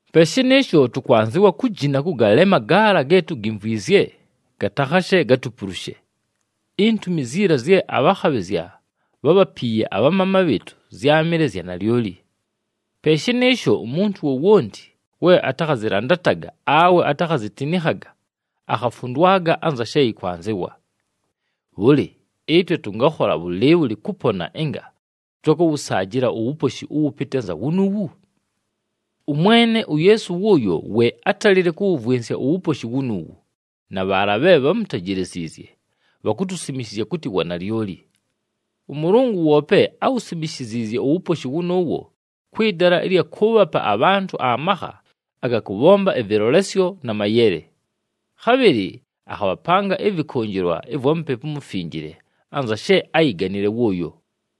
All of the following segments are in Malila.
Pe shɨnɨɨsho, tʉkwanzɨwa kujina kʉgalema gaala ge tugimvwinzye, gatakhashe gatupulushe. Intumi ziila zye abhakhabhɨzya bhábhapiiye abhamaama bhɨɨtʉ zyámɨle zya nalyoli. Pe shɨnɨɨsho umuntu wowonti we atakhazɨlandataga awe atakhazitinikhaga, akhafundwaga anza she yɨkwanzɨwa. Bhʉlɨ, ɨtwe tʉngakhola bhʉlɨɨbhʉlɨ kʉpona ɨnga tʉtakʉwʉsaajɨla uwuposhi ʉwʉpɨtɨ anza wunuuwu? ɄMwene uYeesu wʉʉyo we átalile kʉwʉvwɨnsya uwuposhi wunuuwu, na bhaala bhe bhámutejeleziizye bhakutusimishizya kʉtɨ wanalyoli. ɄMʉlʉngʉ woope áwusimishiziizye uwuposhi wʉnʉʉwo kwɨ dala ɨlya kʉʉbhapa abhantʉ amakha aga kʉbhomba ɨvɨlolesyo na mayele. Khabhɨlɨ akhabhapanga ɨvɨkʉnjɨlwa ɨvwa Mupepu uMufinjile anza she áyiganile wʉʉyo.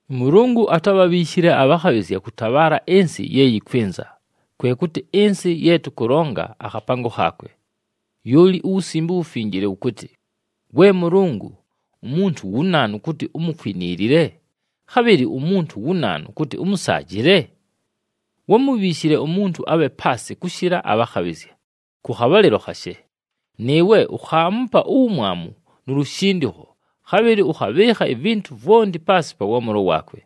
ɄMʉlʉngʉ atábhabhiishile abhakhabhɨzya kʉtabhaala ɨnsɨ ye yɨkwɨnza, kwe kʉtɨ ɨnsɨ ye tʉkʉlonga akhapango khaakwe. Lyoli uWusimbe uWufinjile wʉkʉtɨ, “We Mʉlʉngʉ, umuntu wu naanu kʉtɨ umukwiniilile, khabhɨlɨ umuntu wu naanu kʉtɨ ʉmʉsaajɨle? Wámubhiishile umuntu abhe paasɨ kʉshɨla abhakhabhɨzya kʉ khabhalɨlo khashe. Nɨɨwe ukhaamupa uwumwamu nu lushindikho, khabhɨlɨ ʉkhabhɨɨkha ivintu vwonti paasɨ pa waamʉlo waakwe.”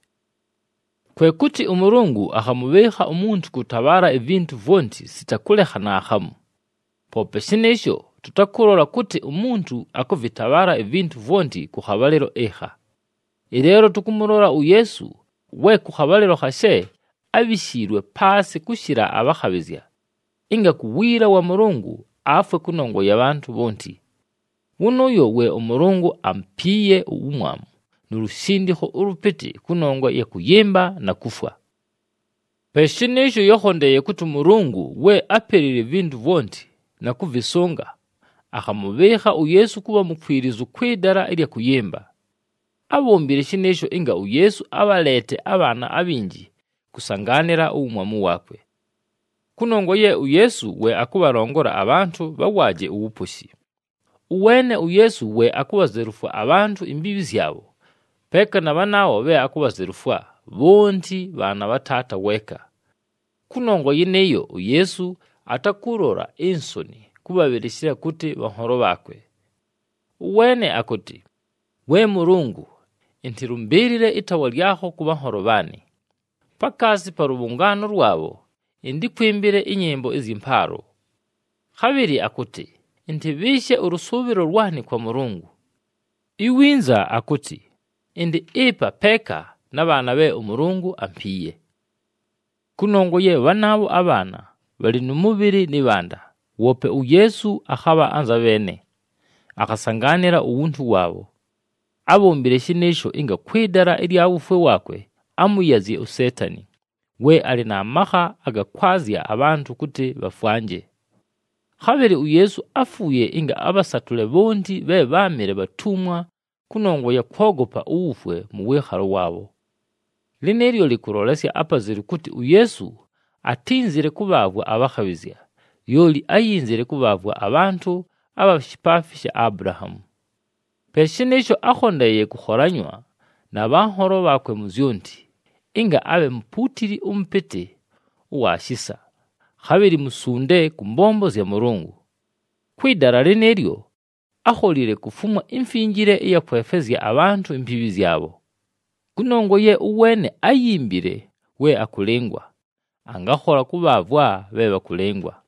Kwe kʉtɨ ʉMʉlʉngʉ akhamʉbhɨɨkha umuntu kʉtabhaala ivintu vwonti sita kʉlekha naakhamu. Poope shɨnɨɨsho, tʉtakʉlola kʉtɨ umuntu akʉvɨtabhaala ivintu vwonti kʉ khabhalɨlo ɨkha. Ɨleelo tʉkʉmʉlola uYeesu, we kʉ khabhalɨlo khashe ábhishiilwe paasɨ kʉshɨla abhakhabhɨzya, ɨnga ku wiila wa Mʉlʉngʉ afwe kʉnongwa ya bhantʉ bhonti. Wʉnʉʉyo we ʉMʉlʉngʉ amupiiye uwumwamu nu lushindikho ʉlʉpɨtɨ kʉnongwa ɨya kʉyɨmba na kufwa. Pe shɨnɨɨsho, yákhondeeye kʉtɨ ʉMʉlʉngʉ we ápelile ivintu vwonti, na kʉvɨsʉnga, akhamʉbhɨɨkha uYeesu kʉbha mukwilizu kwɨ dala ɨlya kʉyɨmba. Ábhombile shɨnɨɨsho ɨnga uYeesu abhaleete abhaana abhinji kʉsangaanɨla uwumwamu waakwe. Kʉnongwa ye uYeesu we akʉbhalongola abhantʉ bhawaaje uwuposhi. Ʉweene uYeesu we akubhazelufwa abhantʉ imbiibhi zyabho, peeka na bhanaabho bhe akubhazelufwa, bhonti bhaana bha Taata weeka. Kʉnongwa yɨnɨɨyo, uYeesu atakʉlola insoni kʉbhabhɨlɨshɨla kʉtɨ bhanholo bhaakwe. Ʉweene akʉtɨ, “We Mʉlʉngʉ, ɨntɨlʉmbɨɨlɨle ɨtaawa lyakho kʉ bhanholo bhaanɨ, pakaasi pa lʉbhʉngaano lwabho ɨntɨkwɨmbɨle ɨnyɨmbo ɨzyɨ mpaalo.” Khabhɨlɨ akʉtɨ, “Ɨntɨbhɨɨshe ʉlʉsʉʉbhɨlo lwanɨ kwa Mʉlʉngʉ.” Iwinza akʉtɨ, “Ɨndɨ ɨpa peeka na bhaana bhe ʉMʉlʉngʉ ampiiye.” Kʉnongwa ye bhanaabho abhaana, bhalɨ nʉ mʉbhɨlɨ nɨ bhanda, woope uYeesu akhabha anza bheene, akhasangaanɨla uwuntu waabho. Ábhombile shɨnɨɨsho ɨnga kwɨ dala ɨlya wufwe waakwe amʉyazye uSeetani, we alɨ na makha aga kwazya abhantʉ kʉtɨ bhafwanje. Khabhɨlɨ uYeesu áfuuye ɨnga abhasatʉle bhonti bhe bháamɨle bhatumwa kʉnongwa ya kwogopa uwufwe mʉ wɨɨkhalo waabho. Lɨnɨɨlyo lɨkʉlolesya apazelu kʉtɨ uYeesu atínzile kʉbhaavwa abhakhabhɨzya, lyoli áyinzile kʉbhaavwa abhantʉ abha shipaafi sha Abulahaamu. Pe shɨnɨɨsho, ákhondeeye kʉkholanywa na bhanholo bhaakwe mu zyonti, ɨnga abhe mupuutili ʉmʉpɨtɨ ʉwa shisa, khabhɨlɨ musunde kʉ mbombo zya Mʉlʉngʉ. Kwɨ dala lɨnɨɨlyo, ákholile kufumwa imfinjile ɨya kwefwezya abhantʉ imbiibhi zyabho. Kʉnongwa ye ʉweene áyimbile we akʉlɨngwa, angakhola kʉbhaavwa bhe bhakʉlɨngwa.